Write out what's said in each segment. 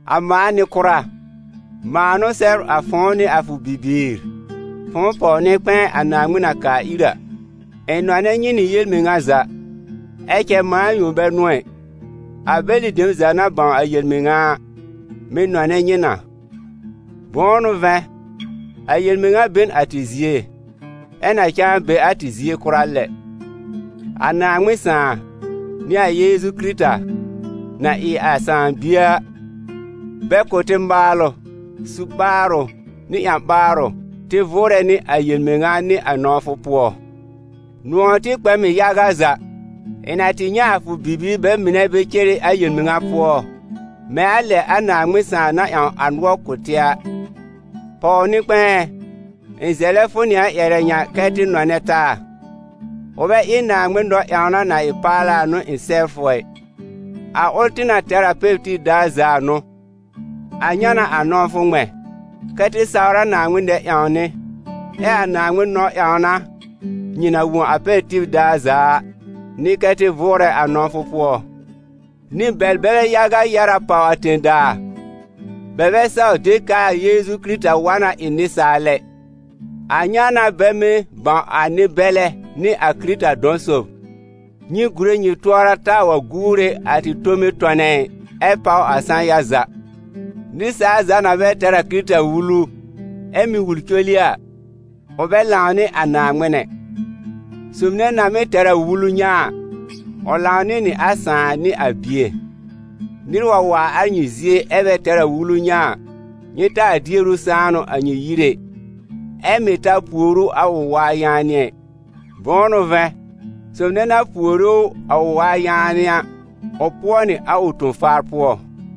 A mãa nɩ-kʋra, mãa n'ʋ sɛbr a fʋ̃ʋ nɩ a fʋ bibiir, fʋ̃ʋ pɔw-nɩ-kpɛ̃ɛ a Naaŋmɩn na kaa ir a. Ɩ̃ nɔnɛ nyɩ nɩ yel-mɩŋa za, ɛ cɛ mãa yõ bɛ n'ʋ ɛ, a bɛlɩ dem za na bãw a yel-mɩŋa a, mɩ̀ nɔnɛ nyɩ na. Bʋ̃ʋ n'ʋ vɛ̃, a yel-mɩŋa be n a tɩ zie, ɛ na cãa be a tɩ zie kʋra lɛ. A Naaŋmɩn Sãà, nɩ a Yeezu Kɩrɩta, na ɩ a Sãà Bie a, bɛ kʋ̀ tɩ maalʋ, su-ɓaarʋ nɩ ƴã-ɓaarʋ tɩ vʋʋrɛ nɩ a yel-mɩŋa nɩ a nɔ̃wfʋ pʋɔ. Nʋ̃ɔ̀ tɩ kpɛ m ɩ yaga za, ɩ̃ na tɩ nyɛ̃ a fʋ bibiir bɛ mɩnɛ bɛ cere a yel-mɩŋa pʋɔ, mɛ̃ a lɛ a Naaŋmɩn Sãà na ƴãw a nʋɔr kʋ̀ tɩ a. Pɔw-nɩ-kpɛ̃ɛ ɛ, ɩ̃ zɛlɛ fʋ nɩ a ƴɛrɛ ŋa kɛ́ tɩ nɔnɛ taa. Ʋ bɛ ɩ Naaŋmɩn nɔ-ƴãwna na ɩ paala n'ʋ ɩ̃ sɛbr fʋ ɛ. A ʋl tɩ na tɛr a pɛr tib daar za a n'ʋ. A ŋa n'a a nɔ̃wfʋ ŋmɛ̃: kɛ́ tɩ sawr a Naaŋmɩn nɛ-ƴãwnɩ. Ɛ a Naaŋmɩn nɔ-ƴãwna, nyɩ na wõ a pɛr tib daar za a, n'ɩ kɛ́ tɩ vʋʋrɛ a nɔ̃wfʋ pʋɔ. Nɩ-bɛlbɛ yaga yɛ́r a pàw a tẽ-daa. Bɛ bɛ saw de k'aa Yeezu Kɩrɩta wa na ɩ nɩsaal ɛ. A ŋa n'a bɛ mɩ́ bãw a nɩ-bɛlɛ nɩ a Kɩrɩta dɔ̃ sob. Nyɩ gúre nyɩ tʋɔra taa wa guure a tɩ tome tɔnɛ ɩ, ɛ páw a sã-ya za. Nɩsaal za na bɛ tɛr a Kɩrɩta wulu, ɛ mɩ́ wul col ɩ a, ʋ bɛ lãw nɩ a Naaŋmɩn ɛ; sob nɛ na mɩ́ tɛr a wulu ŋa a, ʋ lãw nɩ nɩ a Sãà nɩ a Bie. Nɩr wa waar a nyɩ zie ɛ bɛ tɛr a wulu ŋa a, nyɩ taa dier ʋ sãanʋ a nyɩ yir ɛ, ɛ mɩ̀ taa puore ʋ a ʋ waa yaanɩ ɛ. Bʋ̃ʋ n'ʋ vɛ̃, sob nɛ na puore ʋ a ʋ waa yaanɩ a, ʋ pʋɔ nɩ a ʋ ton-faar pʋɔ.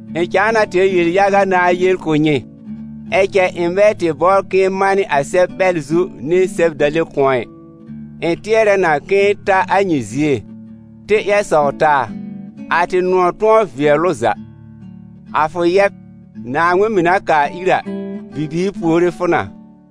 Ɩ̃ cãa na tɛr yel-yaga nãá yel kʋ̀ nyɩ, ɛ cɛ ɩ̃ bɛ tɩ bɔbr k'ɩ̃ɩ manɩ a sɛb-ɓɛl zu nɩ sɛb-dale kʋ̃ɔ ɛ; ɩ̃ tɩɛrɛ na k'ɩ̃ɩ ta a nyɩ zie, tɩ ƴɛr sɔw taa, a tɩ nʋ̃ɔ̀ tʋ̃ɔ vɩɛl ʋ za. A fʋ yɛb, Naaŋmɩn mɩ̀ na kaa ir a, bibiir puore fʋ na.